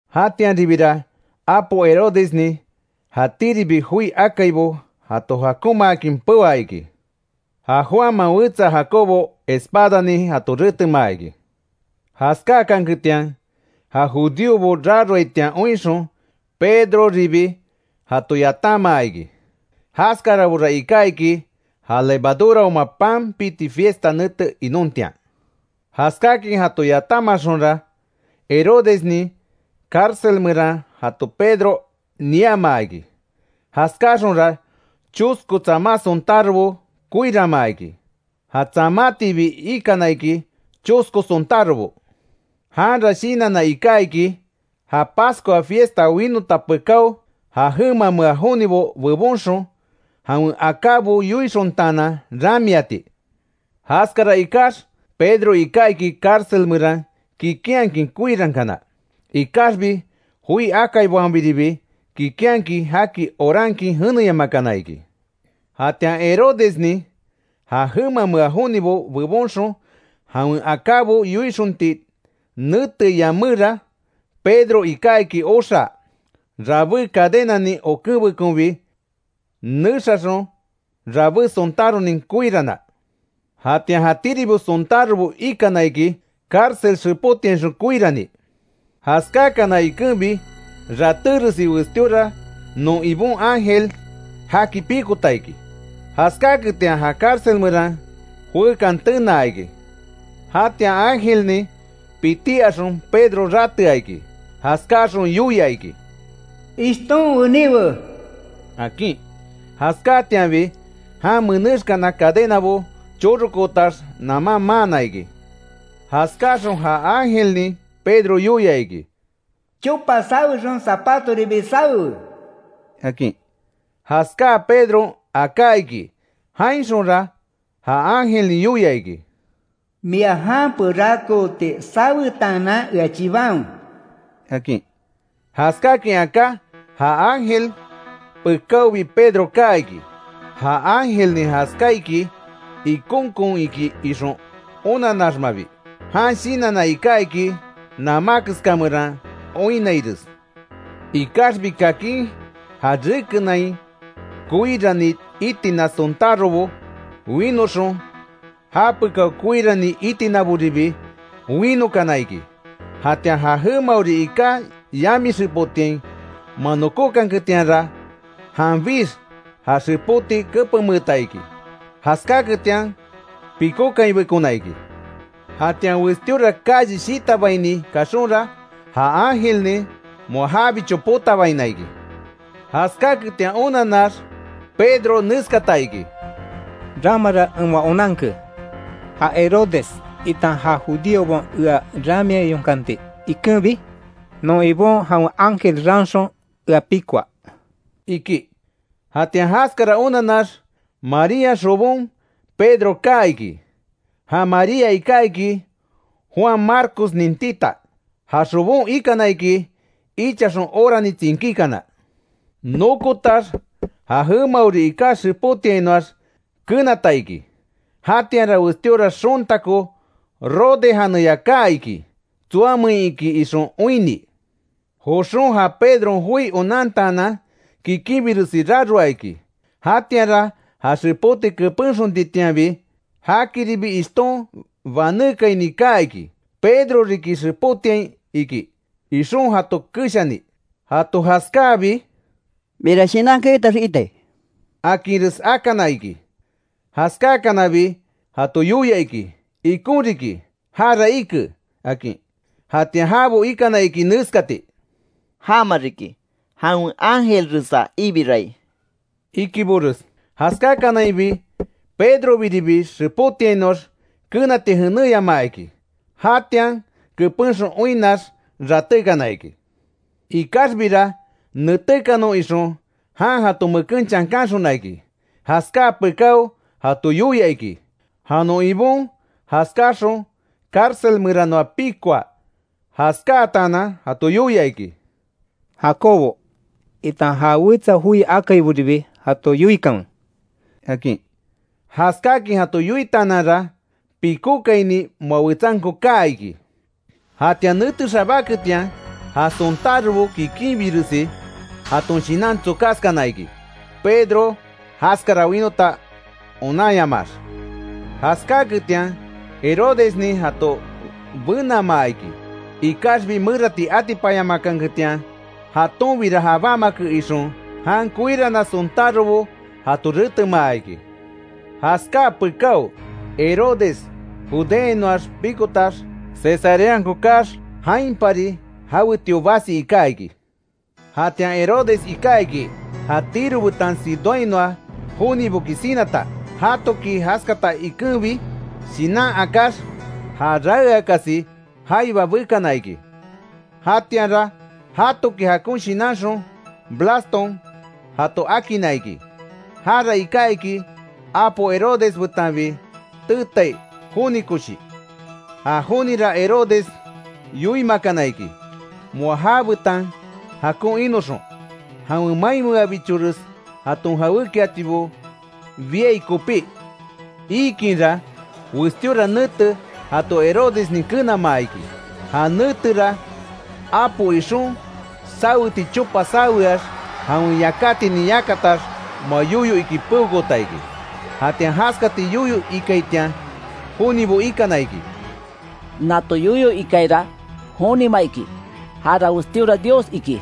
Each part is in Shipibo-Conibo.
Jatianribira apo Herodesnin jatíribi joi akaibo jato jakonmaakin peoa iki. Ja Juanman wetsa Jacobo espadanin jato retemaa iki. Jaskáakanketian, ja judíobo raroaitian oinxon, Pedroribi jato yatanmaa iki. Jaskarabora iká iki ja levaduraoma pan piti fiesta nete inontian. Jaskákin jato yatanmaxonra, Herodesnin cárcel meran jato Pedro niamaa iki. Jaskáaxonra, chosko tsama sontárobo koiranmaa iki. Ja tsamátiibi ikana iki chosko sontárobo. Janra shinanna iká iki, ja Pascua fiesta winota pekáo, ja jemamea jonibo bebonxon jawen akábo yoixontaanan, ramiati. Jaskara ikax Pedro iká iki cárcel meran kikinhakin koirankana. Ikaxbi joi akaibaonbiribi, kikínhakin jaki orankin jeneyamakana iki. Jatian Herodesnin, ja jemamea jonibo bebonxon jawen akábo yoixonti neteai yaméra, Pedro iká iki oxaa, rabé cadenanin okenbekonbi nexaxon, rabé sontáronin koirana. Jatian jatíribi sontárobo ikana iki, cárcel xepótiainxon koirani. Jaskáakana ikenbi, ratéresi westíora non Ibon ángel jaki pikota iki. Jaskáketian ja cárcel meran joekan tenaa iki. Jatian ángelnin pití axon Pedro ratea iki. Jaskáaxon yoia iki: “¡Ishton weníwe!” akin. Jaskáatianbi jan menexkana cadenabo chorokootax naman maana iki. Jaskáxon ja ángelnin Pedro yoia iki: “Chopa sawexon zapatoribi sawewe”, akin. Jaskáa Pedron aká iki. Jainxonra ja ángelnin yoia iki: “Mia jan perakooti sawetaanan, ea chibanwe”, akin. Jaskáakin aká, ja ángel pekáobi Pedro kaa iki, ja ángelnin jaskáaiki ikonkon iki ixon onanaxmabi, jan shinanna iká iki namá keska meran oinnaires. Ikaxbi kakin ja rekenain koirani itina sontárobo winoxon japekao koirani itinaboribi winokana iki. Jatian ja jemaori iká yami xepotiain moa nokókanketianra, janbix ja xepoti kepenmeeta iki; jaskáketian pikókainbekona iki. Jatian westíora calle shitabaini kaxonra, ja ángelnin moa jabicho potabaina iki. Jaskáaketian onanax, Pedro neskata iki: “Ramara en moa onanke, ja Herodes itan ja judíobaon ea ramiayonkanti ikenbi, non Ibon jawen ángel raanxon, ea pikoa”, iki. Jatian jaskara onanax, Marían xobon Pedro kaa iki, ja María iká iki, Juan Marcosnin tita. Ja xobon ikana iki ichaxon orani tsinkíkana. Nokotax, ja jemaori iká xepótiainoax kenata iki, jatianra westíora xontako Rode janeya kaa iki, tsoameinki ixon oinni. Joxon ja Pedron joi onantaanan kikinbiresi raroa iki. Jatianra ja xepóti kepenxontitianbi, jakiribi ishton banékaini kaa iki, Pedro riki xepotiain iki, ixon jato keshani. Jato jaskáabi: —¡Miara shinan keyotax iitai! —akinres akana iki. Jaskákanabi jato yoia iki, ikon riki, jara ike, akin. Jatian jabo ikana iki néskati: —Jama riki, jawen ángelresa ibirai —ikibores. Jaskakanainbi, Pedrobiribi xepótiainoax kenati jeneyamaa iki. Jatian kepenxon oinnax, ratékana iki. Ikaxbira netékanon ixon, jan jato meken chankanxona iki. Jaskáa pekáo jato yoia iki, ja non Ibon jaskáaxon cárcel meranoa pikoa. Jaskáatanan jato yoia iki: —Jacobo, itan ja wetsa joi akaiboribi jato yoikanwe —akin. Jaskáakin jato yoitaananra, pikókaini moa wetsanko kaa iki. Jatian nete xabáketian, ja sontárobo kikinbiresi jaton shinan tsokaskana ikí, Pedro jaskara wínota onanyamaax. Jaskáketian Herodesnin jato benamaa iki, ikaxbi merati atipanyamakanketian, jatonbira jabámake ixon, jan koirana sontárobo jato retemaa iki. Jaskaa pekáo, Herodes Judeainoax pikotax, Cesareanko kaax, jainpari jawetio basi iká iki. Jatian Herodes iká iki, ja Tiro betan Sidónhainoa joniboki sinata. Jatoki jaskata ikenbi shinan akáx, já raeakasi jaiba bekana iki. Jatianra jatoki jakon shinanxon, Blaston jato akinna iki. Jara iká iki, apo Herodes betanbi teetai joni koshi. Ja jonira Herodes yoimakana iki, moa jabetan jakon inoxon, jawen mainmeabichores jaton jawékiatibo biai kopí. Iikinra, westíora nete jato Herodesnin kenamaa iki. Ja netera, apo ixon saweti chopa saweax, jawen yakátinin yakatax moa yoyo iki peokoota iki. Jatian jaskati yoyo ikaitian jonibo ikana iki: “¡Nato yoyo ikaira jonima iki, jara westíora dios iki!”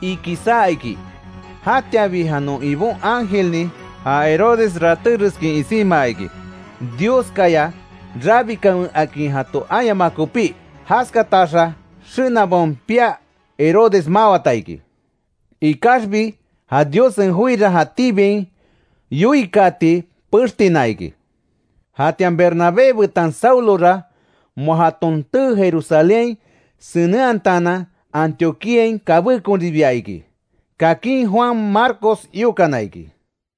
iki saa iki. Jatianbi ja non Ibon ángelnin ja Herodes rátereskin isinmaa iki, Dioskaya rabikanwe, akin jato ayamaa kopí. Jaskataxa xenabaon pia Herodes mawata iki. Ikaxbi ja Diossen joira jatíbiain yoikaati pextina iki. Jatian Bernabé betan Saulora moa jaton tee Jerusalénhain senenhataanan, Antioquíain kabékonribia iki. Kakin Juan Marcos iokana iki.